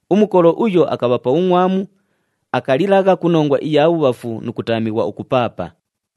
Umukolo uyo akabha pa bhungʼwamu, akalilagha ku nongwa iya bhubhafu nu kutaamighwa ukupaapa.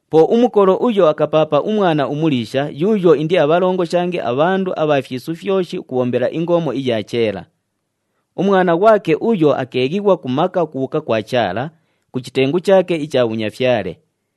Po umukolo uyo akapaapa umwana umuliisha yuuyo indiabhalongoshange abhandu abha fyisu fyoshi ukubhombela ingoomo iya cheela. Umwana ghwake uyo akeeghighwa ku maka ukubhuuka kwa Chaala, ku chitengu chaake icha bhunyafyale.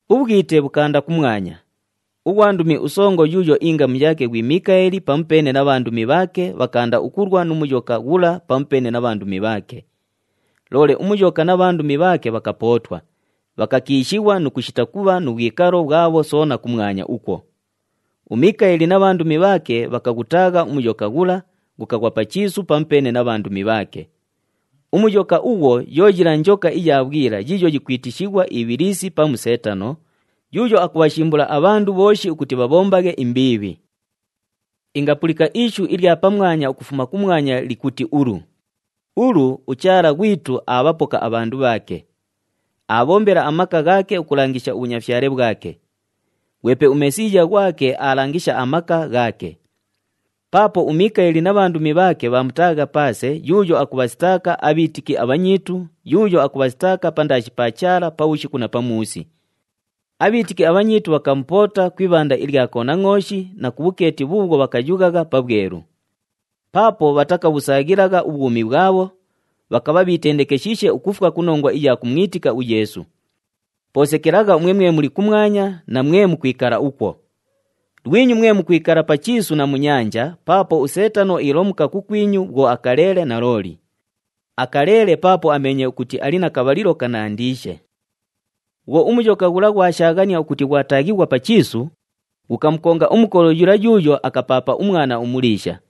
Ubhwite bhukaanda kumwanya. Ughwandumi usongo yuuyo ingamu yaake ghwi Mikaeli pamupeene na bhandumi bhaake, bhakaanda ukulwa nu Muyoka ghula pamupeene na bhandumi bhaake. Loole uMuyoka na bhandumi bhaake bhakapootwa, bhakakiishighwa nu kushita kubha nu bhwikalo bhwabho soona kumwanya ukwo. UMikaeli na bhandumi bhaake bhakaghutaagha uMuyoka ghula, ghukaghwa pa chiisu pamupeene na bhandumi bhaake. UMuyoka ughwo yo yila njoka iya bhwila yiiyo yikwitishighwa Ibhilisi pamu Seetano, yuuyo akubhashimbula abhandu bhooshi ukuti bhabhombaghe imbiibhi. Ingapulika ishu ilya pamwanya ukufuma kumwanya likuti ulu, “Ulu, uChaala ghwitu aabhapoka abhandu bhaake. Aabhombela amaka ghaake ukulangisha ubhunyafyale bhwake! Ghwepe uMesiiya ghwake aalangisha amaka ghaake. Paapo uMikaeli na bhandumi bhaake bhaamutaagha paase yuuyo akubhasitaaka abhiitiki abhanyiitu, yuuyo akubhasitaaka pandaashi pa Chaala pabhushiku na pamuusi. Abhiitiki abhanyiitu bhakamupoota ku ibhanda ilya Konangʼooshi, na ku bhukeeti bhuubhwo bhakayughagha pabhwelu. Paapo bhatakabhusaaghilagha ubhwumi bhwabho, bhakabha bhiitendekeshiishe ukufwa ku nongwa iya kumwitika uYeesu. Po sekelagha umwe mwe muli kumwanya, na mwe mukwikala ukwo! Lwinyu mwe mukwikala pa chiisu na mu nyanja paapo uSeetano iilomuka kukwinyu bhwo akaleele nalooli. Akaleele paapo ameenye ukuti ali na kabhalilo kanandiishe.” Bhwo uMuyoka ghula ghwashaaghania ukuti ghwataaghighwa pa chiisu, ghukamukonga umukolo yula yuuyo akapaapa umwana umuliisha.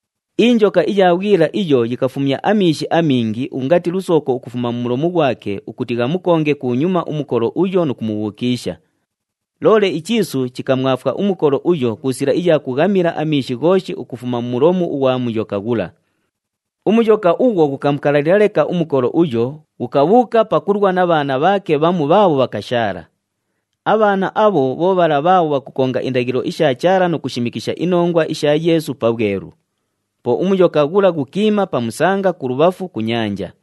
Injoka iya bhwila iyo yikafumya amiishi amingi ungati lusooko ukufuma mu mulomu ghwake ukuti ghamukonge kunyuma umukolo uyo nu kumubhukiisha. Loole ichiisu chikamwafwa umukolo uyo ku sila iya kughamila amiishi ghooshi ukufuma mu mulomu ughwa Muyoka ghula. UMuyoka ughwo ghukamukalalila leka umukolo uyo, ghukabhuuka pakulwa na bhaana bhaake bhamu bhaabho bhakashaala. Abhaana abho bho bhala bhaabho bhakukonga indaghilo isha Chaala nu kushimikisha inongwa isha Yeesu pabhwelu. Po uMuyoka ghula ghukiima pa musanga kulubhafu ku nyanja.